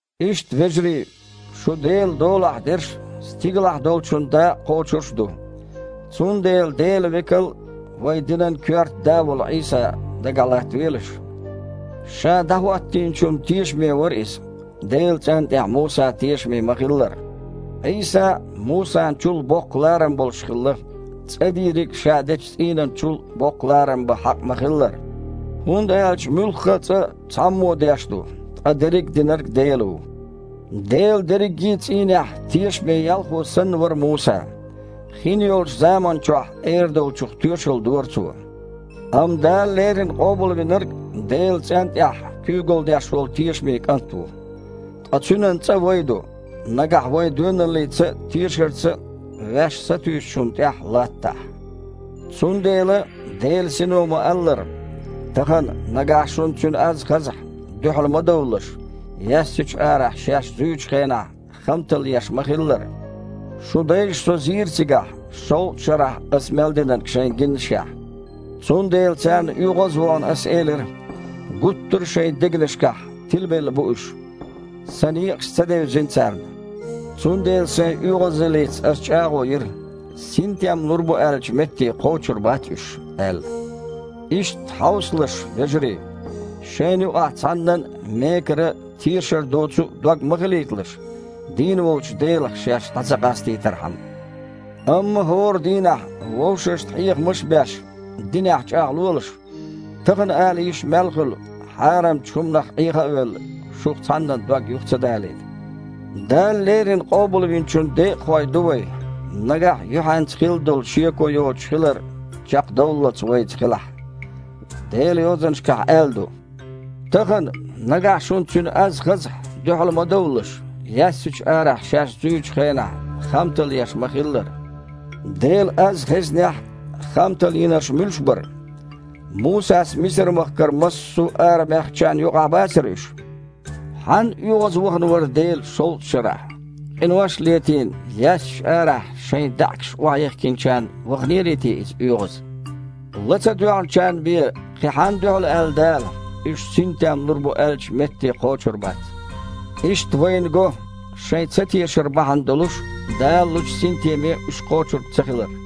Иштта, вежарий, шу Делан долахь дерш а, стигалахь долчун дакъа кхочурш а ду. Цундела Делан Векал а, вайн динан коьрта Да а волу Іийса дагахь латтавелаш. Ша ДІахІоттийначунна тешаме вара Иза, Делан цІентІехь Муса тешаме ма-хиллара. Іийса Мусан чул а боккха ларам болуш хилла, цІа дийриг ша дечу цІийнан чул боккха ларам бан хьакъ ма-хиллара. ХІунда аьлча муьлхха а цІа цхьаммо деш ду, ткъа дерриг а динарг Дела ву. Делан дерриге а цІийнехь тешаме ялхо санна вара Муса. Хинйолчу заман чохь эр долчух тоьшалла дора цо. Амма Дала леррина Къобалвинарг Делан цІентІехь куьйгалла деш волу тешаме КІант ву. Ткъа Цуьнан цІа вай ду, нагахь вай доьналлица а, тешарца а ваьш сатуьйсучунна тІехь латтахь. Цундела, Делан Сино ма-аллара: «Тахана, нагахь шуна Цуьнан аз хазахь, дуьхьал ма довлалаш, яьссачу арахь шаьш зуьйчу хенахь хамталла еш ма-хиллара. Шун дайша Со зийра цигахь, шовзткъа шарахь Аса мел динарг шайна гиннашехь. Цундела, царна оьгІаз а вахана, Аса элира: „Гуттар а шайн дегнашкахь тилабелла бу уьш, Сан некъаш ца девзина царна“. Цундела Сайн оьгІазаллица Ас чІагІо йира, синтем лур бу аьллачу метте кхочур бац уьш аьлла». Иштта, хьовсалаш, вежарий, шайна юкъахь цхьаннан а мекара а, тешар доцу а дог ма хилийталаш, дийна волчу Делах шаьш дІа ца къастийтархьама. Амма хІора дийнахь, вовшашна хьехамаш а беш, динехь чІагІлолаш, «тахана» ала йиш мел хуьлу, хьарамчу хІуманах Іеха а велла, шух цхьаннан дог юха ца далийта. Дала леррина Къобалвинчун декъахой ду вай, нагахь юьхьанца хилла долу шеко йоцуш хилар чекхдовллалц вайца хилахь. Делан Йозанашкахь аьлла ду: «Тахана, нагахь шуна Цуьнан аз хазахь, дуьхьал ма довлалаш, яьссачу арахь шаьш зуьйчу хенахь хамталла еш ма-хиллара». Делан аз хезнехь а, хамталла йинарш муьлш бара? Мусас Мисар-махкара массо а арабаьхначарна юкъахь бацара уьш? Хьанна оьгІазвахана вара Дела шовзткъа шарахь? Къинош а летийна, яьссачу арахь шайн даьІахкаш охьаехкинчарна ваханерий те Иза оьгІаз? Ла ца доьгІначарна бен, кхин хьанна дуьхьал аьлла Дала, уьш «синтем лур бу аьллачу метте кхочур бац»? Иштта вайна го, шайн цатешар бахьана долуш, Дала лучу синтеме уьш кхочург цахилар.